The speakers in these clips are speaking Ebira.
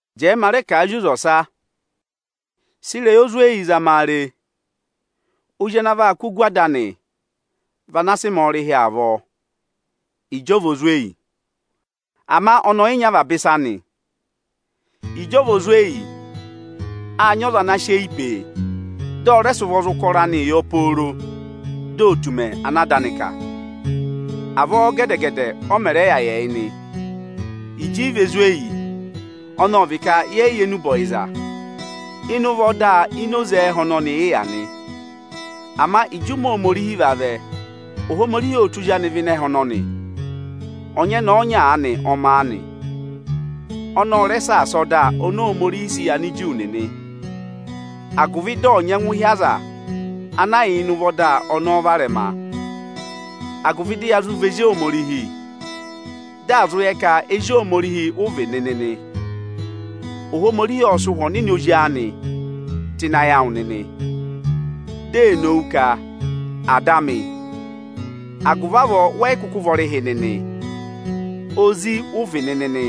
Jẹẹ ma rẹ kà a zị oze ọsa: Sị ịrẹyị ozi oweyi zama a re! Ozi ana vaa kụ́ ogu ada anị vị ana sị mẹẹ ọrịhị avọọ ịjị ọ vị ozweyi, ama ọnị ọyị nyị avaba ịsa nị. Ịjị ọ vị ozweyi, áa nyị aza ana sị eyi pee, dị ọ rẹ sị ụvọ za ụkọrọ anịị yọ pooro dị ò tù ụmẹ ana ada anị kà. Avọọ gẹdẹ-gẹdẹ ọ mẹ̀ rẹ yà yị ẹyị nị. Ịjị ị vị ozweyi (ọnị ọ vị ka yẹẹ̀ yị yẹ enube ọyịza), ịnị ụvọ ọda oze ẹhẹ ọnọnị ị yà nị. Ama ịjị ụmẹ Ohomorihi vavẹ, Ohomorihi ộ tụ́ Ozi anị vẹ ịnị ẹhẹ ọnọnị. Ọnyẹnẹẹ ọnya aanị ọ ma a nị. Ọnị ọ rẹ saasa ọda Aniju nịnị, agụvị dị ọ̀ nyẹngụ hị́ aza ana yà ịnị ụvọ ọda ọnọọ varẹma, agụvị dị ya zụ vị ezi Ohomorihi. Dị à zụ yẹ ka ezi Ohomorihi ụ vị nịnị nị, Ohomorihi ộ sị Ụhwẹ Ọnịnị Ozi anị tụ́ ịnị ayị awụ nịnị, di ee nowu ka: Ada amị! Agụvị avọọ wẹ yị kụkụ vị ọrịhị nịnị, ezi ụ vị nịnị nị.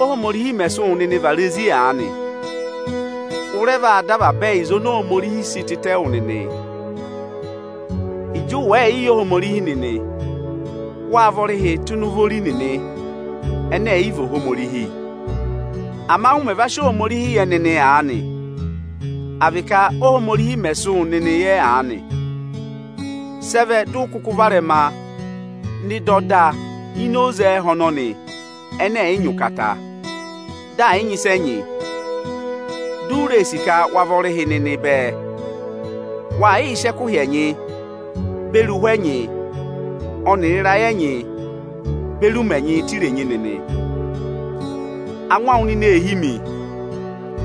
Ohomorihi mẹ̀ sị wụ nịnị vara ezi aanị, ụ rẹ vaa dọ ẹyịza oni Ohomorihi sị tịtẹ wụ nịnị. Ịjị ụ wẹ̀ẹẹ̀ yị yẹ Ohomorihi nịnị, wâ vị ọrịhị tụ́ ịnị ụvọ ori nịnị ẹnẹ ẹ̀ yị vị Ohomorihi. Ama ụ mẹ̀ va sị Ohomorihi yẹ nịnị aanị, à vị ka Ohomorihi mẹ̀ sị wụ nịnị yẹ aanị, sị ẹ vẹ dị ụ kụkụ varẹma nọ ịnị ọda ini oze ẹhẹ ọnọnị ẹnẹ ẹ̀ yị nyị ụkata, dị ẹ̀ yị nyị ịsa ẹ nyị? Di u ree sì ka wa vị ọrịhị ẹnịnị bẹẹ? Wàa yịị sị ẹkụhị ẹnyị beri ụhwẹ ẹnyị ọnịrị ịrayị ẹnyị beri ụmẹ ẹnyịị tụ́ irenyi nịnị. Angwa awụ nịnị ee hí mi.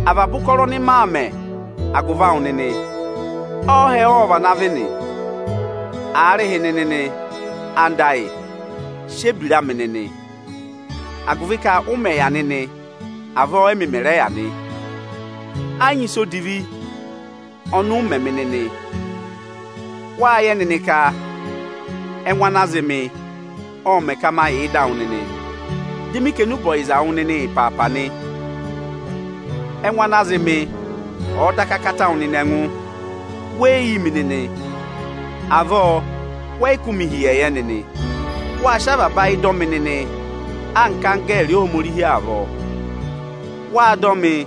Avaba ụkọrọ ọnị maa mẹ̀ agụvị awụ nịnị, ọọhẹ ộ vana vị nị? Aarịhịnị nịnị, anda ayị, sị ebira amị nịnị, agụvị ka ụ mẹ yà nịnị avọọ ẹmị mẹ̀ rẹ yà nị. Ẹ yị nyị ịsa odivi ọnị ụ mẹ mị nịnị. Wâ yẹ nịnị ka ẹngụ ana zị mị, ọ mẹ ka ma yà ịdị awụ nịnị, dị ma kà enube ọyịza wụ nịnị ịpaapa nị. Ẹngụ ana zị mị ọ̀ọ daka kata wụ nịnị ẹngụ, we yi yi mi nịnị, wẹ yị rẹ kụ́ mị hi ịyẹyẹ nịnị. Wâ sị avaba ayị dọ mị nịnị anka anggẹẹrị Ohomorihi avọọ. Wâ dọ mị,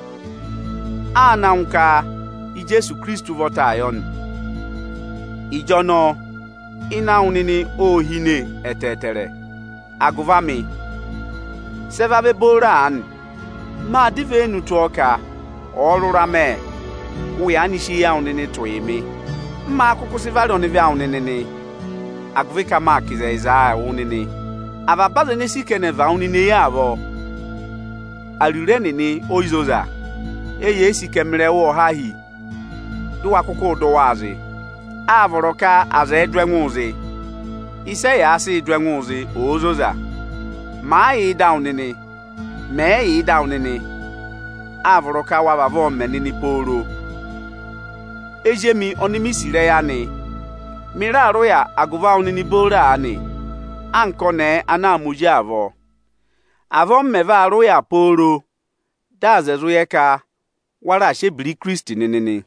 a àa na ngụ ka Ijeesu Ikirisiti ụvọtaa yọ nị. Ịjọnọọ ịnẹ awụ nịnị ô hine ẹtẹẹtẹrẹ agụvị amị, sị ẹ vavẹ booro aanị? Máa dọ ivenu tụ́ ọ ka ọ̀ọ rụra mẹ, ụ yaanị sị eyi awụ nịnị tụ̀ yị mị. M máá kụkụ sị vara ọnịvị awụ nịnị agụvị ka maa kà ịzẹyịzaa wụ nịnị nị? Avaba aza ene ee sì ka ẹnị ẹ̀ và wụ nịnị eyi avọọ, ariro ẹnịnị e yi zoza. Eyee sì ka ẹmịrị ẹwụ nịnị ọ̀ há hi, dị ụ wa kụkụụ dụ ẹnịị zị. Áa vọrọ ka aza ẹ̀ẹ dụ ẹngụụ zị, ịsị ẹyaa sịị dụ ẹngụ zị òo zoza. Màa yà ịdị awụ nịnị, mẹ̀ yị yà ịdị awụ nịnị, áa vọrọ ka wa vavọọ mẹ nịnị pooro. Ezi emi oni mi sì ịrẹyị anị, mị raa rị ụya agụvị awụ nịnị booro aanị anka ọnẹẹ ana aa ma ozi avọọ. Avọọ m mẹ vaa rị ụya pooro dị aza ẹ̀ zụ yẹ ka wa raa sị ebira Ikirisiti nịnị nị.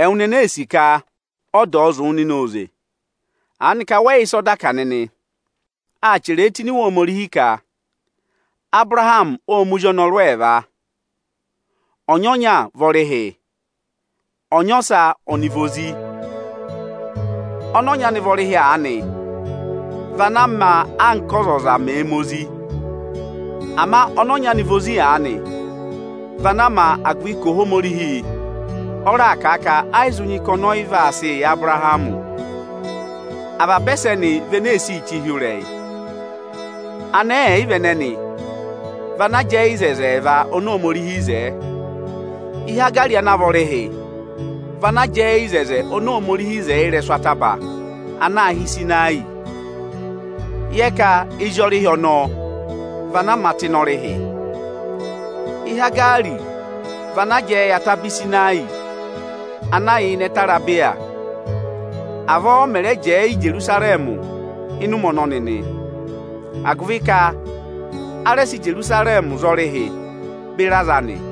Ẹwụ nịnị ene ee sì ka ọda ọ̀ọ zụ̀ wụ nịnị oze, aanị ka wẹ́ yị wụ́ ịsị ọda kà nịnị? Â chẹrẹ ẹ tụ́ ini Iwe Ohomorihi ka: Abụrahamị ọ́ ma ezi ọnọrụ ẹẹva. Ọnyị ọnya vị ọrịhị, ọnyị ọsa ọnị vị ozi. Ọnị ọnyị anị vị ọrịhị aanị vị ana á ma, anka ọzọza mẹ̀ẹ̄ ma ozi. Ama ọnị ọnyị anị vị ozi aanị vị ana á ma, agụvị ka Ohomorihi ọ raà kà a ka ẹ yị zụ nyị ka ọnị ọ yị vaa sị yị Abụrahamị. Avaba ẹsẹnị vị ene e si che ụhịrẹyị. Anẹẹ ẹyịva ẹnẹẹ vị ana jẹẹ yị oto ẹẹva oni Ohomorihi wo. Ihaga ana vị ọrịhị vị ana jẹẹ yị oto oni Ohomorihi wo ịrẹsụ ataba ana aā hị́ Ịsịnayị. Yẹ ka ezi ọrịhị ọnọọ vị ana a ma tụ́ ịnị ọrịhị. Ihaga vị ana jẹẹ yị ataba Ịsịnayị ana yà ẹtẹ Arebiya. Avọọ ọ mẹ̀ rẹ jẹẹ yị Ijerusarẹmị ịnị ụmẹ ọnọnị nị, agụvị ka a rẹ sị Ijerusarẹmị za ọrịhị beri aza anị.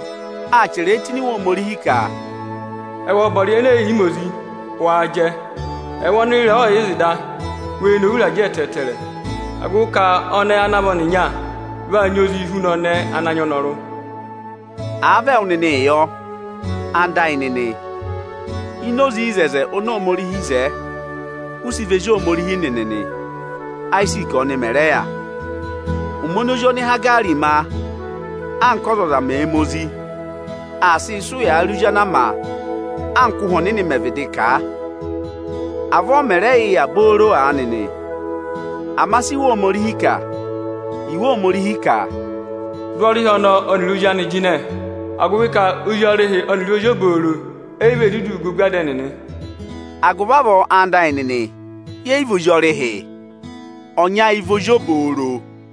Â chẹrẹ tụ́ ini Iwe Ohomorihi ka: Ẹwụ ọbọrị ẹnẹ ẹ̀ yị ma ozi, waa jẹ! Ẹwụ ọnị ịrẹẹ ọọ̀ yị zị da, wee nowu ịrajẹ ẹtẹẹtẹrẹ, agụvị ka ọnẹẹ ana vị ọnịnya vaa nyị ozii huna ọnẹẹ ana nyị ọnọrụ. Àa vị ẹwụ nịnị yọ, anda ayị nịnị, ini oze oto oni Ohomorihi wo, ụ sị vị ezi Ohomorihi nịnị nị, Ayiziiki ọnị mẹ̀ rẹ yà. Ụmẹ ọnọọ ozi oni Ihaga ma, anka ọzọza mẹ̀ẹ̄ ma ozi, aa sị ụyaa rị ozi ana a ma anka Ụhwẹ Ọnịnị mẹ̀ vịdị kà a. Avọọ ọ mẹ̀ rẹ yị yà booro aanị nị. Ama sí Iwe Ohomorihi vịdị kà? Iwe Ohomorihi ka: Dụ ọrịhị ọnọọ ọnịrị ozi anị jịnẹ, agụvị ka, ozi ọrịhị ọnịrị ozi obooro e yi vee duduu gà ogu ada ẹnịnị. Agụvị avọọ, anda ayị nịnị, yẹ yị vị ozi ọrịhị, ọnyị ayị vị ozi obooro.